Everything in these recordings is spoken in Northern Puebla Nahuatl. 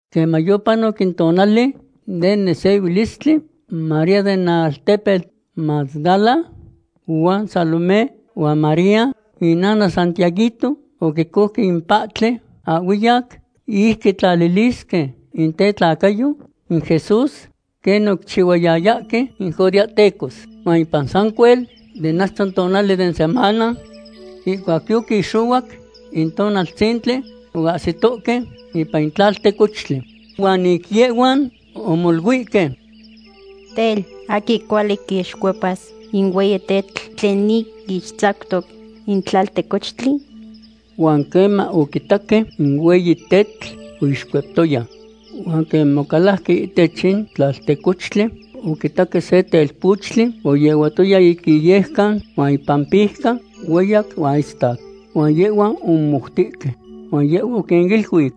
Queman yopanoc in tonali den nesehuilistli, María den altepetl Magdala huan Salomé huan María inana Santiaguito oquicouque in pahtli ahhuiyac ic quitlalilisque in tetlacayo in Jesús, quen oquichihuayayahque in judeahtecos. Huan ipan sancuel den achto tonali den semana, ihcuac yoquixohuac in tonaltzintli, oahsitohque ipan in tlaltecochtli. Huan ic yehhuan omoluihque: ―Tel, ¿aquin cuali quixcuepas in hueyi tetl tlen ic ixtzactoc in tlaltecochtli? Huan queman oquitaque, in hueyi tetl yoixcueptoya. Huan queman ocalajque ihtech in tlaltecochtli, oquitaque se telpochtli oyehuatoya ic iyejcan huan ipampijca hueyac huan istac. Huan yehhuan omomoutihque. Huan yehhua oquiniluic: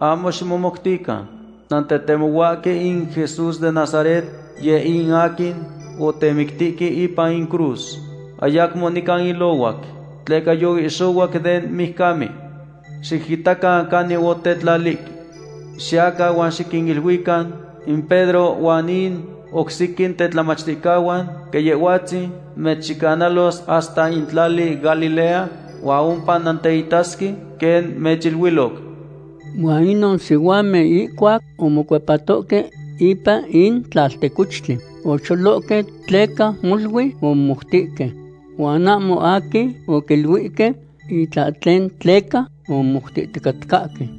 ―Ahmo ximomoutican. Nantetemohuahque in Jesús den Nazaret, yeh in aquin otemictihque ipan in cruz. Ayacmo nican ilohuac tleca yoihxohuac den mijcamen. Xiquitacan canin otetlalihque. Xiyacan huan xiquiluican in Pedro huan in oc sequin tetlamachticahuan quen Yehhuatzin mechyecanalos hasta in tlali Galilea huan ompa nanteitasque quen mechiluiloc. Huan inon sihuamen ihcuac omocuepatoque ipan in tlaltecochtli, ocholohque tleca molui omomoutihque. Huan ahmo aquin oquiluihque itlahtlen tleca omomoutihticatcahque.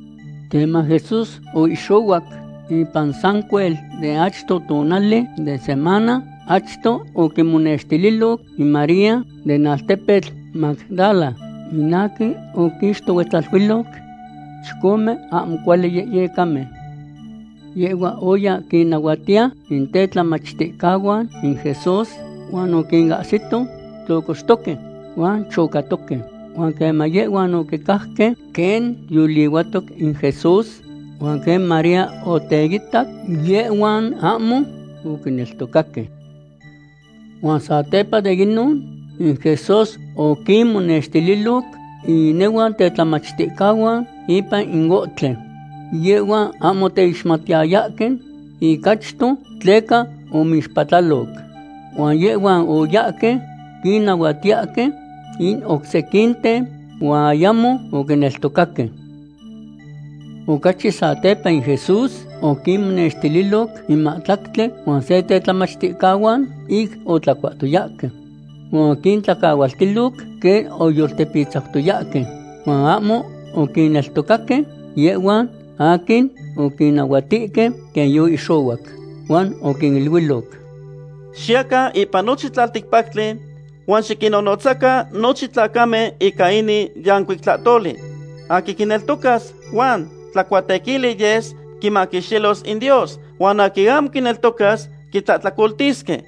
Queman Jesús oihxohuac ipan sancuel den achto tonali den semana, achto oquimonextililoc in María den altepetl Magdala, in aquin oquixtohuetzaluiloc chicome ahmo cuali yehyecamen. Yehhua oya quinnahuatiya in tetlamachticahuan in Jesús huan oquinahsito tlocoxtoque huan chocatoque. Huan queman yehhuan oquicajque quen yolihuatoc in Jesús huan quen María oteitac, yehhuan ahmo oquineltocaque. Huan satepa de inon, in Jesús oquinmonextililoc in inehuan tetlamachticahuan ipan ohtli. Yehhuan ahmo oteixmatiyayahque ic achto tleca omixpatlaloc. Huan yehhuan oyahque quinnahuatiyahque in oc sequinten, huan ayamo oquineltocaque. Ocachi satepa in Jesús oquinmonextililoc in mahtlactli huan se tetlamachticahuan ic otlacuahtoyahque. Huan oquintlacahualtiloc quen oyoltepitzautoyahque huan ahmo oquinneltocaque yehhuan aquin oquinnahuatihque quen yoihxohuac. Huan oquiniluiloc: ―Xiyacan ipan nochin tlalticpactli huan xiquinnonotzacan nochin tlacamen ica inin yancuic tlahtoli. Aquin quineltocas huan tlacuatequili yes, quimaquixtilos in Dios. Huan aquin ahmo quineltoca, quitlahtlacoltisque.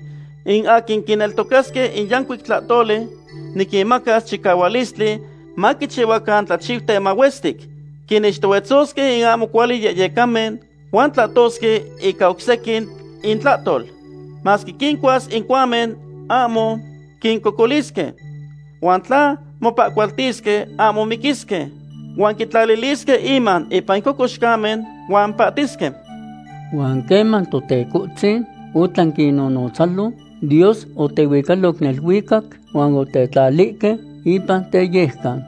In aquin quineltocasque in yancuic tlahtoli niquinmacas chicahualistli maquichihuacan tlachiuten mahuestic. Quinixtohuetzosque in ahmo cuali yehyecamen huan tlahtosque ica oc sequin intlahtol. Masque quincuas in cuamen ahmo quincocolisque. Huan tla mopahcualtisque, ahmo miquisque. Huan quitlalilisque inman ipan in cocoxcamen huan pahtisque. Huan queman Totecohtzin otlan quinnotzalo, Dios otehuicaloc neluicac huan otetlalihque ipan teyejcan.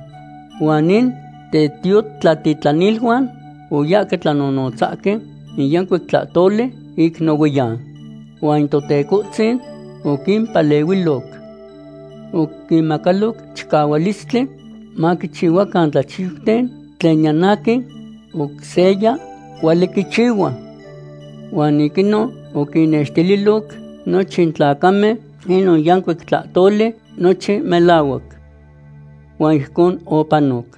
Huan in tetiotlatitlaniluan oyahque tlanonotzahque in yancuic tlahtoli ic nohuiyan. Huan in Totecohtzin oquimpalehuiloc. Oquinmacaloc chicahualistli maquichihuacan tlachiuten tlen niyan aquin oc seya cuali quichihua. Huan ic inon oquinnextililoc nochin tlacamen inon yancuic tlahtoli nochin melahuac. Huan ijcon opanoc.